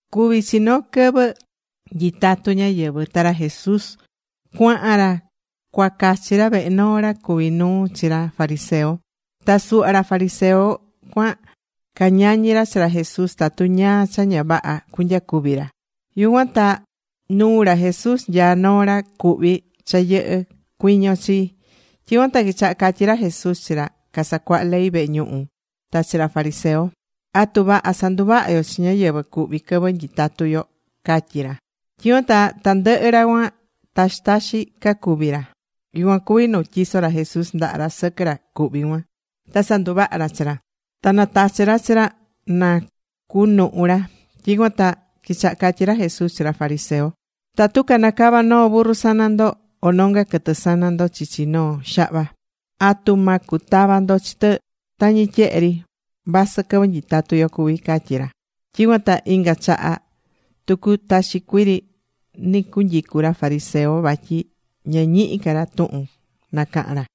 Cuví chi noo quɨvɨ nyitatú ñáyɨvɨ. Ta ra Jesús cuahan ra cua cachi ra vehe noo ra cuví nuu chi ra fariseo. Ta suhva ca fariseo cuan cañañi ra chi ra Jesús tatu ñáá cha ña vaha cunyacuvi ra. Yucuan ta nuu ra Jesús nyaá noo ra cuhví cha yɨhɨ́ cuiño chii. Tyicuan ta quichaha catyi ra Jesús chi ra casacuaha ley vehe ñuhu ta chi ra fariseo: ―¿Atu vaha sanduvaha yo chi ñáyɨvɨ cuhví quɨvɨ nyitatú yo? ―catyí ra. Tyicuan ta tandɨhɨ ra cuan, taxi taxi cacuvi ra. Yucuan cuví nu tyiso̱ ra Jesús ndaha ra sɨquɨ ra cuhví cuan. Ta sanduvaha̱ ra chi ra. Ta natachi̱ ra chi ra na cunuhu ra. Tyicuan ta quichaha catyi ra Jesús chi ra fariseo: ―Tatu canacava noo burru sana ndo, o nonga quɨtɨ sana ndo chichi noo xahva, ¿atu ma cutava ndo chi tɨ tañi tyehe ri, vasɨ quɨvɨ nyitatú yo cuví? ―catyí ra. Tyicuan ta inga chaha tucu taxi cuii ri nɨcunyicu ra fariseo. Vatyi ña ñihi ca ra tuhun nacahan ra.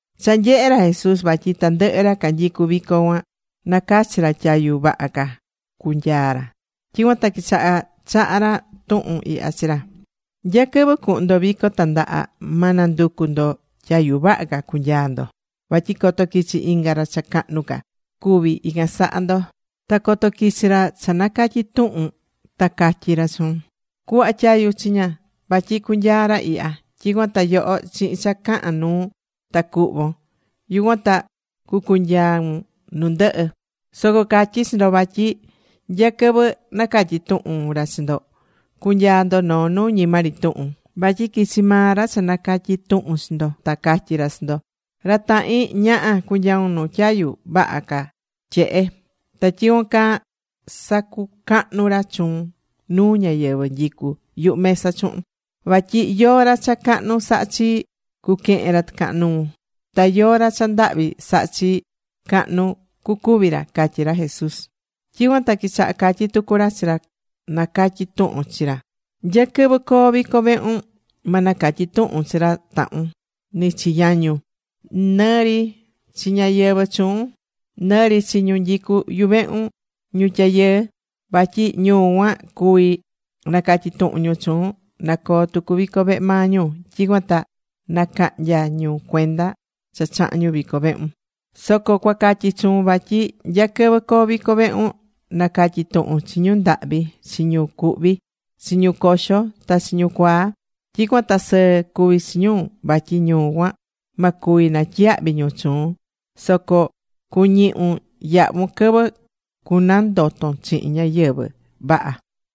Cha nyehe̱ ra Jesús vatyi tandɨhɨ ra canyicú vico cuan nacachí ra tyayu vaha ca cunyaa ra. Tyicuan ta quichaha chaha ra tuhun ihya chi ra: ―Nya quɨvɨ cuhun ndo vico tandaha, ma nanducu ndo tyayu vaha ca cunyaa ndo. Vatyi coto quichi inga ra cha cahnu ca cuvi ican saha ndo, ta coto quichi ra cha nacatyi tuhun ta catyí ra chuun: “Cu̱hva tyayu chiña. Vatyi cunyaa ra ihya.” Tyicuan ta yoho chihin cha cahán nuun, ta cuhvon. Yucuan ta cunyaun nu ndɨhɨ. Soco catyí chi ndo, vatyi nya quɨvɨ nacatyi tuhun ra chi ndo, cunyaa ndo noo nu ñima ri tuhun. Vatyi quichi maa ra cha nacatyi̱ tuhun chi ndo ta catyi ra chi ndo: “Ra tahin, ña̱ha, cu̱nyaun nu tyayu vaha tyehe.” Ta tyicuan caa sacucahnu ra chuun nu ñáyɨvɨ nyicú yuhu mesa chuhun. Vatyi yóó ra cha cahnu sahá chii, cuquehen ra tɨcahan nuu. Ta yóó ra cha ndahvi sahá chii, cahnu cucuvi ra ―catyí ra Jesús. Tyicuan ta quichaha catyi tucu ra chi ra nacatyi̱ tuhun chi ra: ―Nya quɨvɨ coo vico vehun, ma nacatyi tuhun chi ra tahun, nɨ chi yañun, nɨ ri chi ñáyɨvɨ chuun, nɨri chi ñu nyicú yuvehun ñu tyayɨɨ. Vatyi ñu cuan cuví nacatyi tuhun ñu chuun, na coo tucu vico vehe maa ñu. Tyicuan ta nacahnya ñu cuenda cha chaha̱n ñu vico vehun. Soco cua catyi chuun vatyi nya quɨvɨ coo vico vehun, nacatyi tuhun chi ñu ndahvi, chi ñu cuhví, chi ñu coxo, ta chi ñu cuaa. Tyicuan ta sɨɨ cuví chuun, vatyi ñu cuan ma cuvi natyiyahvi ñu chuun. Soco cuñihun yahvun quɨvɨ cunandoton chihin ñáyɨvɨ vaha.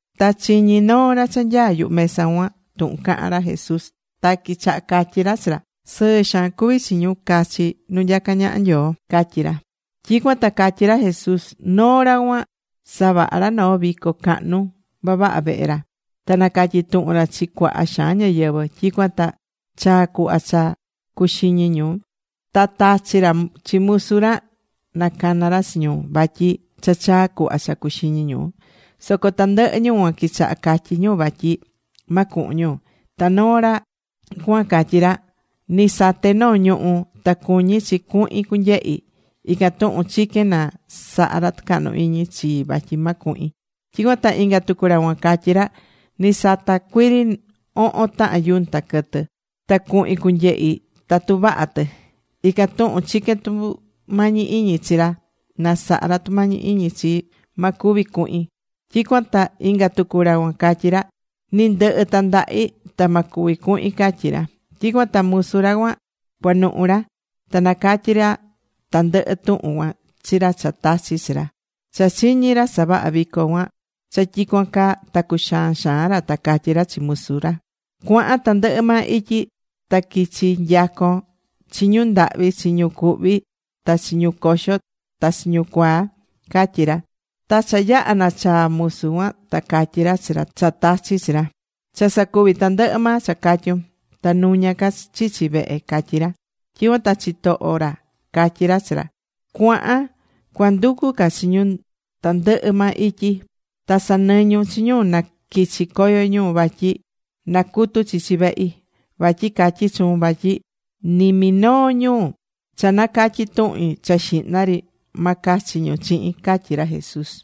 Ta chiñi̱ noo ra cha nyaá yuhu mesa cuan tuhun cahán ra Jesús. Ta quichaha catyí ra chi ra: ―Sɨɨ xaan cuvi chi ñu cachi nu nyacá ñaha Nyoo ―catyí ra. Tyicuan ta catyí ra Jesús: ―Noo ra cuan savaha̱ ra noo vico cahnu vavaha vehe ra. Ta nacatyi̱ tuhun ra chi cuaha xaan ñáyɨvɨ. Tyicuan ta chaa̱ cuhva cha cuxiñi ñu, ta tachi̱ ra chi musu ra nacana ra chi ñu. Vatyi cha chaa̱ cuhva cha cuxiñi ñu. Soco tandɨhɨ ñu cuan quichaha catyí ñu vatyi ma cuhun ñu. Ta noo ra cuan catyí ra: “Ni sate̱ noo ñuhú. Ta cuñí chi cuhin cunyehi. Ican tuhun chiquén na saha ra tucahnu iñi chii vatyi ma cuhin.” Tyicuan ta inga tucu ra cuan catyí ra: “Ni sata cuiri ohon tahan yunta quɨtɨ. Ta cuhin cunyehi tatu vaha tɨ. Ican tuhun chiquén tumañi iñi chi ra na saha ra tucahnu iñi chii, vatyi ma cuvi cuhin.” Tyicuan ta inga tucu ra cuan catyi ra: “Ni ndɨhɨ tandahi, ta ma cuvi cuhin”, catyí ra. Tyicuan ta musu ra cuan cuanuhu ra. Ta nacatyi ra tandɨhɨ tuhun cuan chi ra cha tachi̱ chi ra. Cha chiñi̱ ra savaha vico cuan cha tyicuan caa, ta cuxaan xaan ra. Ta catyí ra chi musu ra: “Cua̱han tandɨhɨ maa ityi. Ta quichi nyacon chi ñu ndahvi, chi ñu cuhví, ta chi ñu coxó, ta chi ñu cuaa”, catyí ra. Ta cha yaha̱ nachaa̱ musu cuan ta catyi̱ ra chi ra cha tachi̱ chi ra: “Cha sacuvi̱ tandɨhɨ maa cha catyún. Ta nuñá ca chichi vehe”, catyí ra. Tyicuan ta chitoho ra catyí ra chi ra: “Cua̱han cua nducu ca chi ñu tandɨhɨ maa ityi. Ta sa̱nɨñun chi ñu na quichi coyo ñu, vatyi na cutu chichi vehi. Vatyi catyí chuun vatyi ni minoo ñu cha nacatyi̱ tuhin cha xihna ri, ma cachi ñu chihin” ―catyí ra Jesús.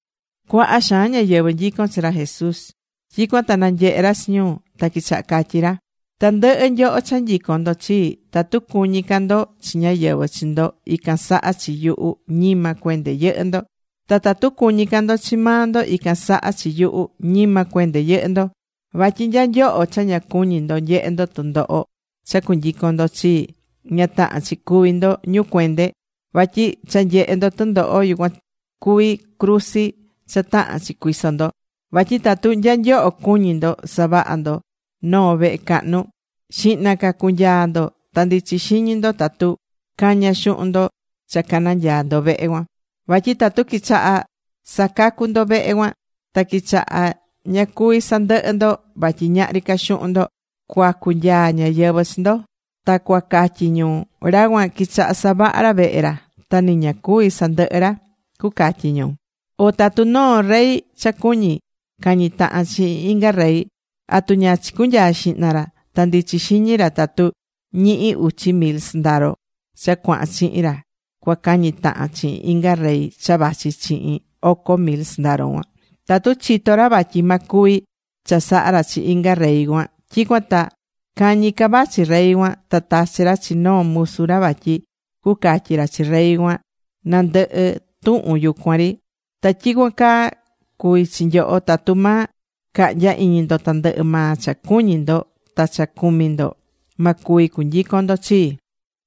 Cuaha xaan ñáyɨvɨ nyicón chi ra Jesús. Tyicuan ta nanyehe ra chi ñu, ta quichaha catyí ra: ―Tandɨhɨ nyoho cha nyicón ndo chii, tatu cuñí ca ndo chi ñáyɨvɨ chi ndo ican saha chi yuhu, ñima cuende yɨhɨ́ ndo. Ta tatu cuñí ca ndo chi maa ndo ican saha chi yuhu, ñima cuende yɨhɨ́ ndo. Vatyi nya nyoho cha ña cuñí ndo nyehe ndo tundoho cha cunyicon ndo chii, ña tahán chi cuví ndo ñu cuende, vatyi cha nyehe ndo tɨndoho yucuan cuví cruzi cha tahán chi cuiso ndo. Vatyi tatu nya nyoho cuñí ndo savaha ndo noo vehe cahnu, xihna ca cunyaa ndo ta ndichi xiñi ndo tatu caña xuhun ndo cha cananyaa ndo vehe cuan. Vatyi tatu quichaha sacacu ndo vehe cuan, ta quichaha ña cuví sandɨhɨ ndo vatyi ñahri ca xuhun ndo, cuacu nyaa ñáyɨvɨ chi ndo. Ta cuacatyi ñu: “Ra cuan quichaha savaha ra vehe ra, ta nɨ ña cuví sandɨhɨ ra”, cucatyi ñu. O tatu noo rey cha cuñí cañi tahan chihin inga rey ¿atu ña chicunyaa xihna ra ta ndichi xiñi ra tatu ñihi uchi mil sɨndaro cha cuahan chihin ra cua cañi tahan chihin inga rey cha vachi chihin oco mil sɨndaro cuan? Tatu chitó ra vatyi ma cuvi chasaha ra chi inga rey cuan, tyicuan ta cañi ca vachi rey cuan, ta tachi ra chi noo musu ra vatyi cucatyi ra chi rey cuan na ndɨhɨ tuhun yucuan ri. Ta tyicuan caa cuví chi nyoho. Tatu ma cahnya iñi ndo tandɨhɨ maa cha cuñi ndo ta cha cumi ndo, ma cuvi cunyicon ndo chii.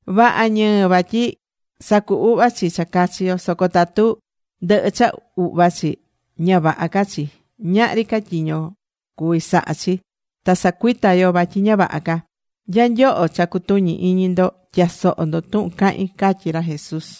’Vaha ñɨɨ vatyi sacu uhva chi cha cachi yo. Soco tatu ndɨhɨ cha uhva chi, ña vaha ca chi. Ñahri ca tyiño cuví saha chi. Ta sacuita yo vatyi ña vaha ca. Nya nyoho cha cutuñí iñi ndo, tya̱soho ndo tuhun cahín ―catyí ra Jesús.